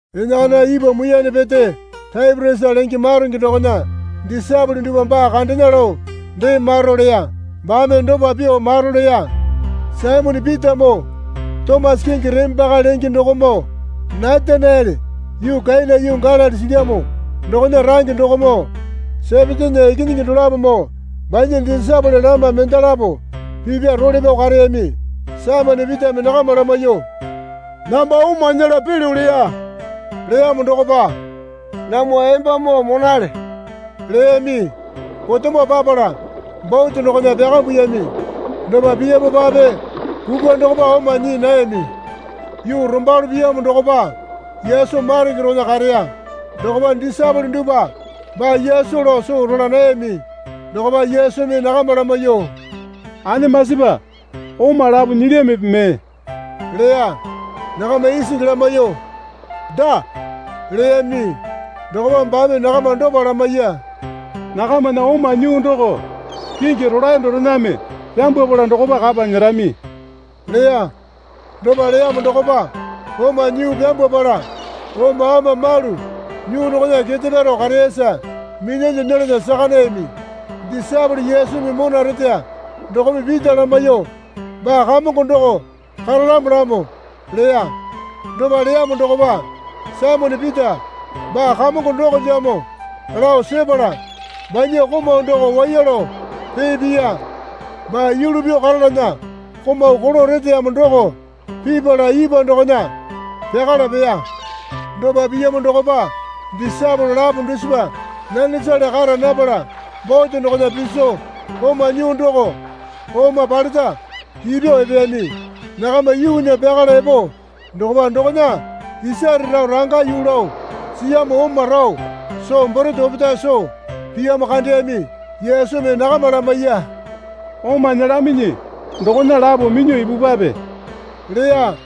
Enakana ipwa muiyane pete Taipiriasa lenge maronge dokona disaepole dupwa baa kandena lao dee maro leya. Baame dopa pyuo maro leya. Saimone Pitamoo Tomasa kingi Reme Paka lenge dokomoo Nataniele yuu Kena yuu Galili silyamo dokona range dokomoo Sepetena ikinyingi dolapomoo banya disaepole lama mendalapo pipya role pyao kareyami. Saimone Pitame nakama lamaiyuo, Namba oma nyela pelyo leya. Leyamo dokopa, Namwa embamoo monale leyami. Potemo papala bote dokona pyakambuyami. Dopa piyamopape kukwa dokopa oma nyii nayami. Yuu rombalo piyamo dokopa Yesu maronge dokona kareya. Dokopa disaepole dupwa baa Yesu lao soo rola nayami. Dokopa Yesumi nakama lamaiyuo, Anemasipa, oma lapo nyilyamipi mee? leya. Nakama isingi lamaiyuo, Daa leyami. Dokopa baame nakama dopa lamaiya. Nakamana oma nyuu doko kingi rolae dorename pyambwapala dokopa kapa nyerami leya. Dopa leyamo dokopa oma nyuu pyambwapala oma ama malu nyuu dokona kete pyaro kareyasa minyalyuo nyelana saka nayami. Disaepole Yesumi mona reteya dokome Pita lamaiyuo, Baa Kamongo doko karalamolamo, leya. Dopa leyamo dokopa Saimone Pita baa Kamongo dokolyamo lao sepala banya komau doko waiya lao pee piya. (Baa yulu pyuo karalana komau kolo reteyamo doko.) Pipala ipwa dokona pyakala peya. Dopa piyamo dokopa disaepole lapo dusipa nanesale kara napala bote dokona piso oma nyuu doko oma paleta ipyuo epeyami. Nakama yuunya pyakala epo dokopa dokona isare rao ranga yuu lao siyamo oma rao soo borete opetae soo piyamo kandeyami. Yesumi nakama lamaiya. Oma nyelaminyi dokona lapo minyuo ipupwape, leya.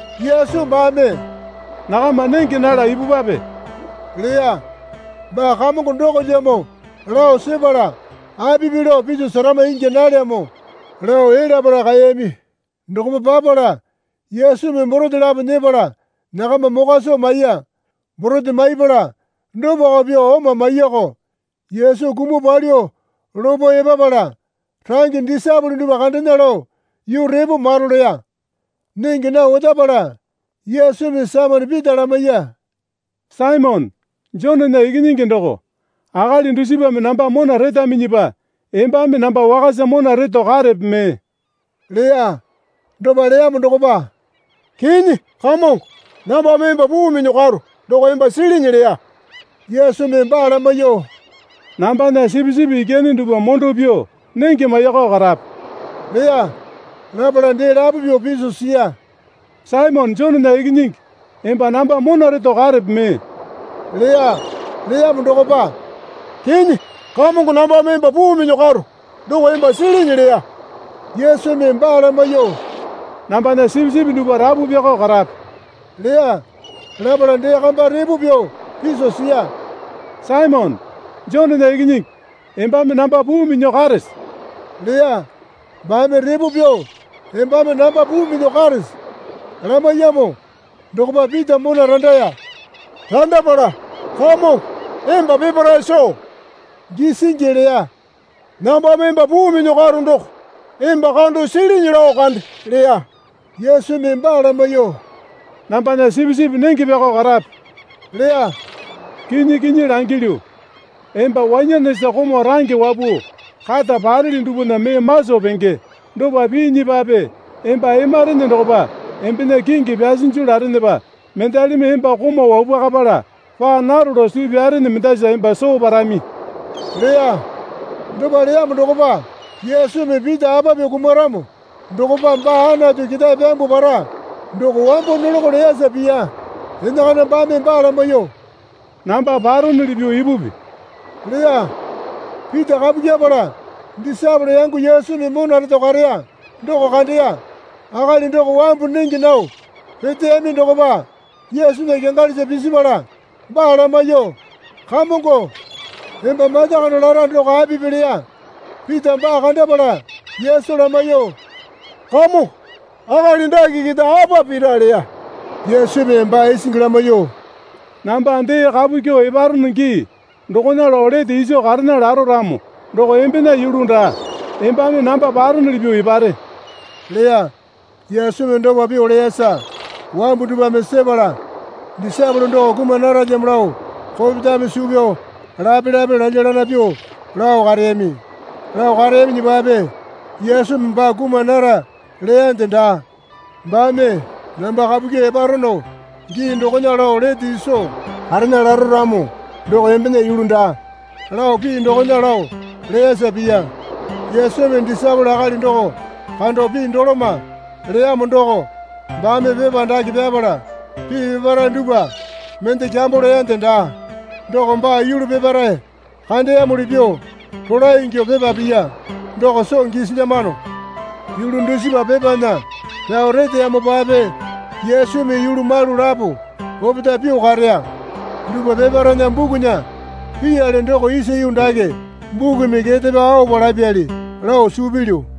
Yesu baame, Nakama nenge nala ipupwape leya. Baa Kamongo dokolyamo lao sepala apipi lao piso serama ingya nalyamo lao elyapala kaeyami. Dokopa papala Yesumi borete lapo nyepala nakama mokwa soo maiya. Borete maipala dopako pyuo oma maiyako. Yesu kumuo palyuo lopo epapala range disaepole dupwa kandena lao yuu repo maro leya. Nenge nao otapala Yesumi Saimone Pita lamaiya. Saimone, Jonena ikinyingi doko, akali dusipame namba mona retaminyipa embame namba wakasa mona reto karepe mee? leya. Dopa leyamo dokopa, Kinyi, Kamongo, nambame emba puu minyuo karo doko emba silinyi leya. Yesumi baa lamaiyuo, Nambana sipisipi ikyane dupwa mondo pyuo nenge maiyakao karape leya. Lapala dee lapo pyuo piso siya. Saimone Jonena ikinyingi, emba namba mona reto karepe mee? leya. Leyamo dokopa, Kinyi, Kamongo nambame emba puu minyuo karo doko emba silinyi leya. Yesumi baa lamaiyuo, Nambana sipisipi dupwa rapu pyakao karape leya. Lapala dee kamba repo pyuo piso siya. Saimone, Jonena ikinyingi, embame namba puu minyuo karese? leya. Baame repo pyuo, Embame namba puu minyuo karese? lamaiyamo dokopa Pita mona randaya. Randapala, Kamongo, emba peparae soo gisingi leya. Nambame emba puu minyuo karo doko emba kando silinyi lao kande, leya. Yesumi baa lamaiyuo, Nambana sipisipi nenge pyako karape, leya. Kinyi kinyi langilyu, emba wanyanesa komau range wapuo kata pareli dupwana mee maso pingi. Dopa piinyipape emba emarene dokopa embena kingi pyasinju larenepa mendalimi emba komau wapwakapala paa naro lao suu pyarene mendasa emba soo parami leya. Dopa leyamo dokopa, Yesumi Pita apa pyuo kumaramo dokopa baa Anatu ketae pyambuo para, doko wambo nolakao leyasa piya. Enakana baame baa lamaiyuo, Namba paronuli pyuo ipupi leya. Pita kapu kyepala disaepole yango Yesumi mona reto kareya doko kandeya. Akali doko wambu nenge nao peteyami dokopa Yesunya kyangalisa pisipala baa lamaiyuo, Kamongo, emba mata kando lara doko apipi? leya. Pita baa kandapala Yesu lamaiyuo, Kamongo, akali dake keta apa pira? leya. Yesumi baa isingi lamaiyuo, Namba dee kapu kyuo eparono gii dokona lao lete iso karena laro ramo doko embena yulu daa. Embame namba paronuli pyuo epare leya. Yesumi dopa pyuo leyasa wambu dupwame sepala disaepole doko kuma naralyamo lao kopetame suu pyao lapelape lalyalana pyuo lao kareyami. Lao kareyaminyipape Yesumi baa kuma nara leyande daa. Baame, Namba kapu kyuo eparono gii dokona lao lete iso karena laro ramo doko embena yulu daa, lao pii dokona lao leyasa piya. Yesumi disaepole akali doko kando pii doloma leyamo doko baame pepa dake pyapala pii peparae dupwa mende kyambo leyande daa. Doko baa yulu peparae kandeyamuli pyuo rolae ingyuo pepa piya doko soo gisilyamano. Yulu dusipa pepana pyao reteyamopape Yesumi yulu malu lapo opetae pyuo kareya dupwa peparaena bukunya piyali doko isa yuu dake bukumi kete pyao aopa lapyali lao suu pilyu.